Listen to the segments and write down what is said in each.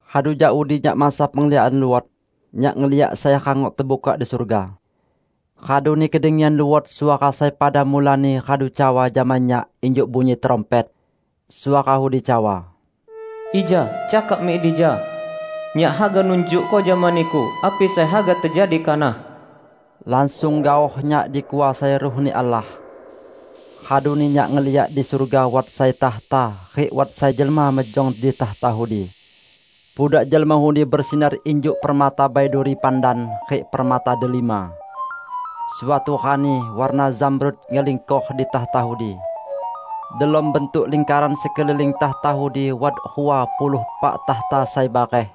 Radu jak udi nyak mansa pengliakan luot. Nyak ngeliak sai rangok tebukak di surga. Raduni kedengian luot suara sai pada mulani radu cawa jama nyak injuk bunyi trumpet. Suara udi cawa, "Ija cakak mik dija. Nyak haga nunjukko jama niku api sai haga tejadi kanah." Langsung gaoh nyak dikuasai Ruh-Ni Allah. Raduni nyak ngeliak di surga wat sai takhta, rik wat sai jelma mejong di takhta udi. Pudak jelma udi besinar injuk permata baiduri pandan rik permata delima. Suatu rani warna zamrud ngelingkor di takhta udi. Delom bantuk lingkaran sekeliling takhta udi wat rua puluh epak takhta sai bareh.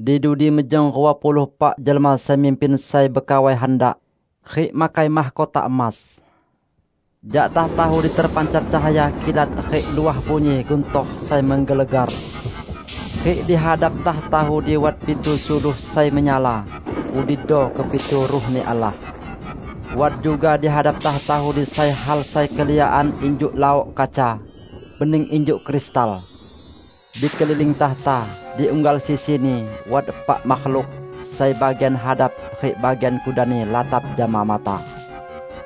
Di dudi mejong rua puluh epak jelma sai mimpin sai bekawai handak, rik makai mahkota emas. Jak takhta udi terpancar cahaya kilat rik luah bunyi guntor sai menggelegar. Rik di hadap takhta udi wat pitu suluh sai menyala; udido kepitu Ruh-Ni Allah. Wat juga di hadap takhta udi sai hal sai keliakan injuk laok kaca, bening injuk kristal. Di keliling takhta, di unggal sisini, wat epak makhluk, sai bagian hadap rik bagian kudanni latap jama mata.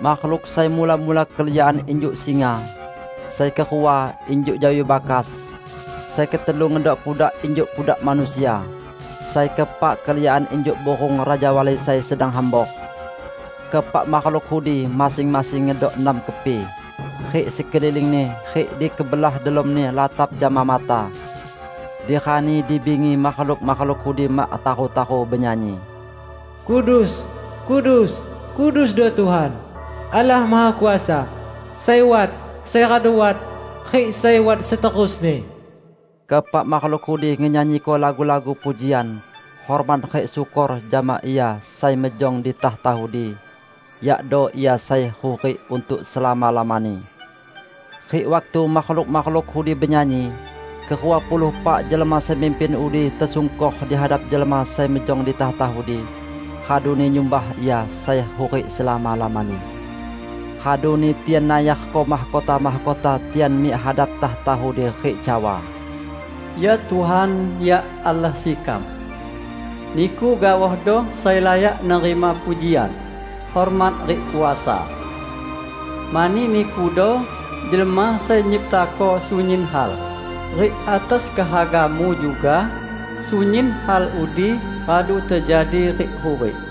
Makhluk sai mula-mula keliakan injuk singa. Sai kerua, injuk jawi bakas. Sai ketelu ngedok pudak injuk pudak manusia. Sai keepak, keliakan injuk burung rajawali sai sedang hambor. Keepak makhluk udi, masing-masing ngedok enam kepi, rik sekelilingni rik di kebelah delomni latap jama mata. Di rani di bingi makhluk-makhluk udi mak taru-taru benyanyi, "Kudus, kudus, kudusdo Tuhan, Allah Mahakuasa; sai wat, sai radu wat, rik sai wat seterusni." Keepak makhluk udi ngenyanyiko lagu-lagu pujian, hormat rik syukor jama Ia sai mejong di takhta udi, yakdo Ia sai hurik untuk selama-lamani. Rik waktu makhluk-makhluk udi benyanyi, kerua puluh epak jelma sai mimpin udi tesungkor di hadap jelma sai mejong di takhta udi, raduni nyumbah Ia sai hurik selama-lamani. Raduni tian nayarko mahkota-mahkota tian mik hadap takhta udi rik cawa, "Ya Tuhan, ya Allah sekam! Niku gaohdo sai layak nerima pujian, hormat rik kuasa. Mani Nikudo jelma sai nyiptako sunyin hal, rik atas kehaga-Mu juga sunyin hal udi radu tejadi rik hurik."